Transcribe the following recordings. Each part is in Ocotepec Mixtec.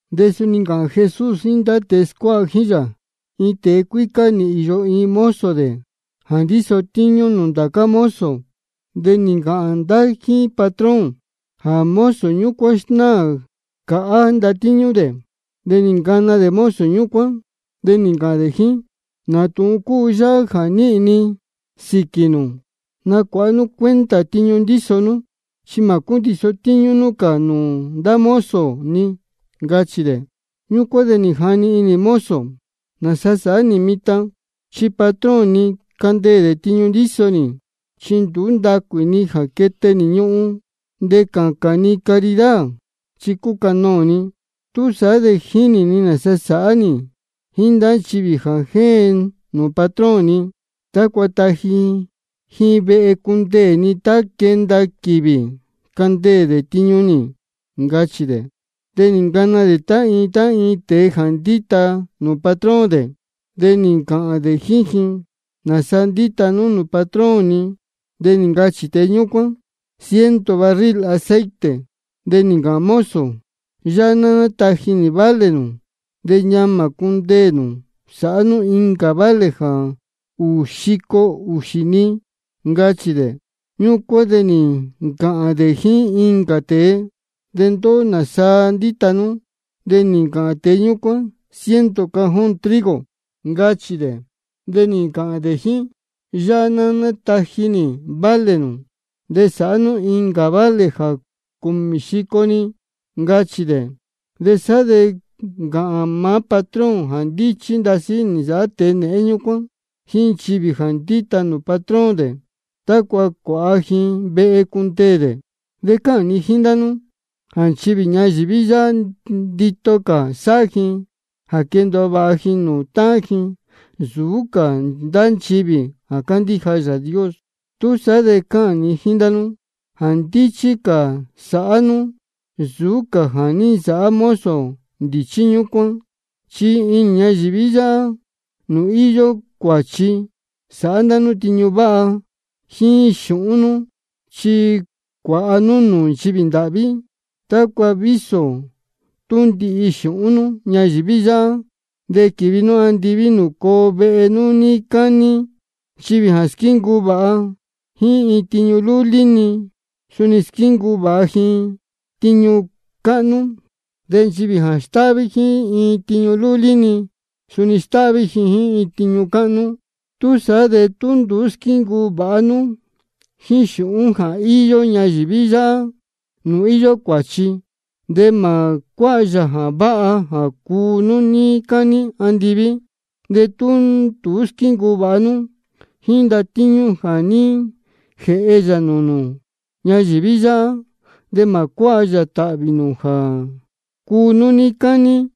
De suni nī ncāhān Jesús jíín ndá tēe scuáha jíín yā: Iin tēe cuícá nī īyo iin mozo dē jā ndíso tíñú nūū ndá cā mozo. De nī ncāhān ndá jíín patrón jā mozo ñúcuán snáā cāhá ndatíñú dē. De nī ncana dē mozo ñúcuán, de nī ncāhān dē jíín: ¿Nā tūhun cúu yáhá jā ní nīhīn ni sīquī nū? Nacuāha nú cuenta tiñu ndíso nú, chi mā cúndiso tíñú nú cā nūū ndá mozo ni, ncachī dē. Ñúcuán de nī jani inī mozo: ¿Nāsa sāhá nī mitan? Chi patrón ni candeē dē tiñu ndíso nī. Chi nduú ndacuī ni jā quete nī ñuhun, de jā cācān ni caridad chi cucanoō ni. Túsaá de jínī ni nāsa sāhá nī jíín ndá nchivī jā jéen nūū patrón ni, tácua taji ji vehe cundeē ni tá quenda quīvī candeē dē tiñu nī. Ncachī dē. De nī ncana dē tá iin iin tēe jā ndíta nūū patrón dē. De nī ncāhān dē jíín iin: ¿Nāsaa ndíta nú nūū patrón ni? De nī ncachī tēe ñúcuán: Ciento barril aceite. De nī ncāhān mozo: Yáhá ná táji nī vale nū, de ñamā cundeē nū sāhá nú incā vale jā ūū xico ūxī-ni, ncachī dē. Ñúcuán de nī ncāhān dē jíín incā tēe: ¿De ndóhó, nāsaa ndíta nú? De nī ncāhān tēe ñúcuán: Ciento cajón trigo, ncachī dē. De nī ncāhān dē jíín: Yáhá ná táji nī vale nū, de sāhá nú incā vale jā cūmī xico-ni, ncachī dē. Sá de nī ncāhān maá patrón jā ndíchí ndasí nī nsāhá tēe nēhén ñúcuán jíín nchivī jā ndíta nūū patrón dē, tácua cuāha ji vehe cundeē dē. De cáhān ni jíín ndá nú jā nchivī ñayīví yáhá, ndito cā sáhá ji jā quendōo vāha ji nūū táhán ji, nsūú cā ndá nchivī jā cándíja Yāā Dios. Túsaá de cáhān ni jíín ndá nú jā ndíchí cā sāhá nú nsūú cā jā ní nsāhá mozo ndīchí ñúcuán. Chi inī ñayīví yáhá nūū íyó cuāchi, sāhá ndá nú tiñu váha jíín xūhún nú, chi cuāha nú nūū nchivī ndāhví, tácua vísō tú ndihi xūhún nú ñayīví yáhá, de quīvi nú andiví nūū coo vehe nú níí cání. Nchivī jā squíncuu vāha jíín iin tiñu lúlí-ni, suni squíncuu vāha ji jíín tiñu cáhnú. De nchivī jā stáhví jíín iin tiñu lúlí-ni, suni stáhví ji jíín tiñu cáhnú. Túsaá de tú nduú squíncuu vāha nú jíín xūhún jā íyó ñayīví yáhá nūū íyó cuāchi, de mā cuáha yā jā váha jā cuu nú níí cání andiví. De tú nduú squíncuu vāha nú jíín ndatíñú jā ní jēhe núú yā nūū nū ñayīví yáhá, de mā cuáha yā tāhvī jā cuu nú níí cání.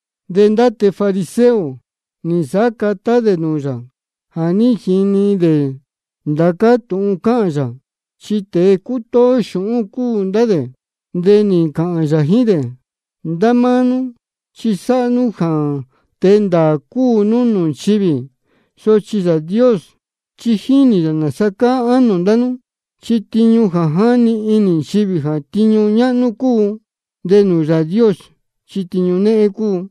De ndá tēe fariseo nī nsāhá catá dē nūū yā jā ní jini dē ndācá tūhun cáhān yā, chi tēe cútóó xūhún cúu ndá dē. De nī ncāhān yā jíín dē: Ndá máá nú chi sáhá nú jā tēe ndāā cúu nú nūū nchivī. Sochi Yāā Dios chi jínī yā nāsa cáá ánō ndá nú. Chi tiñu jā jáni inī nchivī jā tiñu ñáhnú cúu, de nūū Yāā Dios chi tiñu néhén cúu.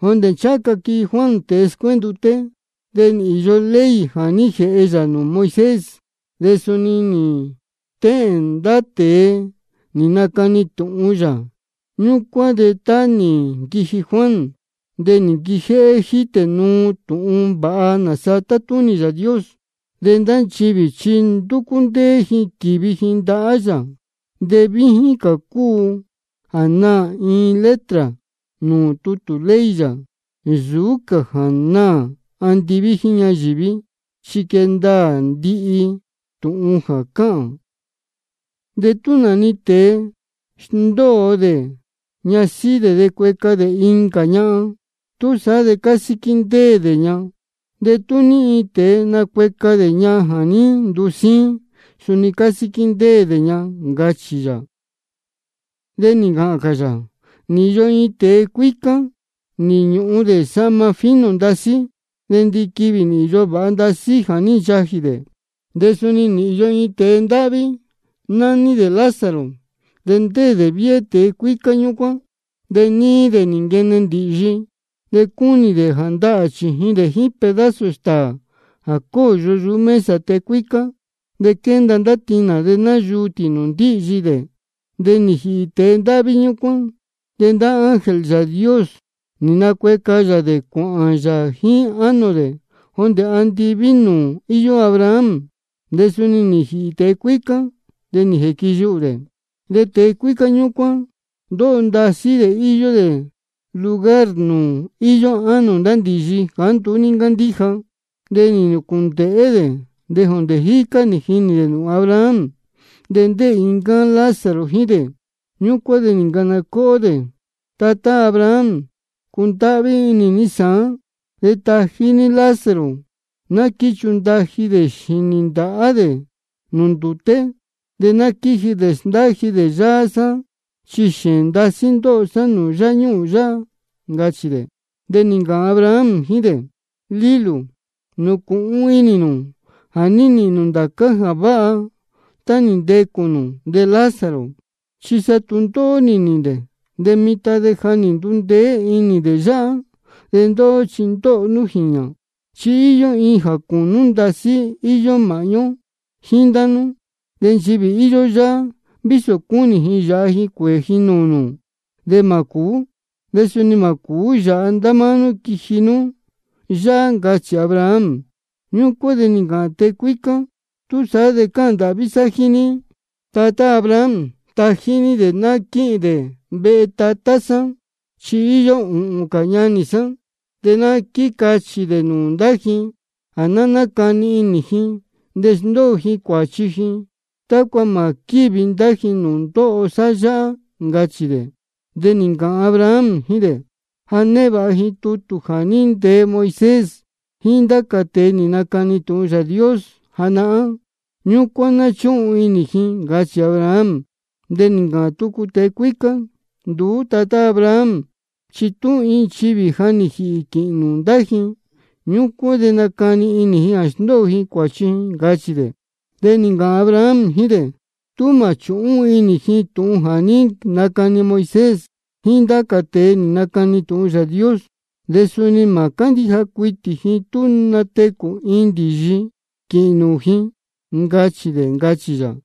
Jondē ncháha ca quiji Juan tēe scuénduté, de nī īyo ley jā ní jēhe Yāā Dios nūū Moisés, de suni nī stéhēn ndá tēe nī nacani tūhun yā. Ñúcuán de tá nī nquiji Juan, de nī nquijéhé jítē nuu tūhun vāha nāsa tátúnī Yāā Dios. De ndá nchivī chi ndúcú ndéé ji quívi ji ndahá yā. De víjín cā cúu jā naā iin letra nūū tutū ley yā nsūú cā jā naā andiví jíín ñayīví, chi quee ndaā ndihi tūhun jā cáhān. De tú nā-ni tēe sndóo dē ñasíhí dē de nacueca dē incā ñahan, túsaá de cásíquí ndéē dē ña. De tú iin tēe nacueca ñahan jā ní ndusíín, suni cásíquí ndéē dē ña, ncachī yā. De nī ncāhān cā yā: Nī īyo iin tēe cuícá, nī ñūhun dē sahma fino ndasí. De ndiquivī nī īyo vāha ndasí jā ní nchajī dē. De suni nī īyo iin tēe ndáhví, nání dē Lázaro, de ndéē dē viéhé tēe cuícá ñúcuán, de níí dē nī nquene ndīhyi. De cúnī dē jā ndahā chījin dē jíín pedazo stāā jā cóyo yuhú mesa tēe cuícá. De quénda ndá tinā de náyuu tī nūū ndíhyi dē. De nī jīhī tēe ndáhví ñúcuán, de ndá ángel Yāā Dios nī nacueca yā dē cuāhān yā jíín ánō dē jondē andiví nūū íyó Abraham. De suni nī jīhī tēe cuícá, de nī jīquiyuhū dē. De tēe cuícá ñúcuán ndóho ndasí dē íyó dē lugar nūū íyó ánō ndá ndīyi jāá nduú ní ncándíja. De nī nūcūndēhé dē, de jondē jícá nī jinī dē nūū Abraham, de ndéē iin ncáá Lázaro jíín dē. Ñúcuán de nī ncana cóhó dē: Tatá Abraham, cundáhví inī ní sāán, de tají ní Lázaro, ná quíchundaji dē xīnī ndāhá dē nūū ndūté, de ná quíji dē sndáji dē yáá sá. Chi xēēn ndóho sá nūū yáñuhūn yáhá, ncachī dē. De nī ncāhān Abraham jíín dē: Lílū, nūcūhun inī nū jā ní nīhīn nū ndācá jā váha tá nī ntecū nū, de Lázaro chi sa tūndóhó nī nīhīn dē. De mitan de ja nī ndundeé inī dē yáhá, de ndóhó chi ndóho nú jīñā. De suni íyó iin jā cūnú ndasí íyó māhñú ó jíín ndá nú. De nchivī íyó yáhá, vísō cúnī ji jā yāha ji cuēē ji nūū nū, de mā cūú. De suni mā cūú yāha ndá máá nú quiji nú yáhá. Ncachī Abraham. Ñúcuán de nī ncāhān tēe cuícá: Túsaá de cáhān ndāhví sá jíín ní, tatá Abraham, tají ní dē ná quíhīn dē vehe tatá sá. Chi íyó ūhūn cā ñanī sá, de ná quícachī dē nūū ndá ji jā ná nácani inī ji de sndóo ji cuāchi ji, tácua mā quívi ndá ji nūū ndóho sá yáhá, ncachī dē. De nī ncāhān Abraham jíín dē: Ja névāha ji tutū jā ní ntee Moisés jíín ndá cā tēe nī nacani tūhun Yāā Dios janahán. Ñúcuán ná chúhun inī ji, ncachī Abraham. De nī ncāhān tucu tēe cuícá: Nduú, tatá Abraham, chi tú iin nchivī ja nī jīhī quīhīn nūū ndá ji, ñúcuán de nacani inī ji jā sndóo ji cuāchi ji, ncachī dē. De nī ncāhān Abraham jíín dē: Tú mā chūhún inī ji tūhun jā ní nacani Moisés jíín ndá cā tēe nī nacani tūhun Yāā Dios, de suni mā cándíja cuitī ji tú natecū iin ndīyi quīhīn nūū ji, ncachī dē, ncachī yā.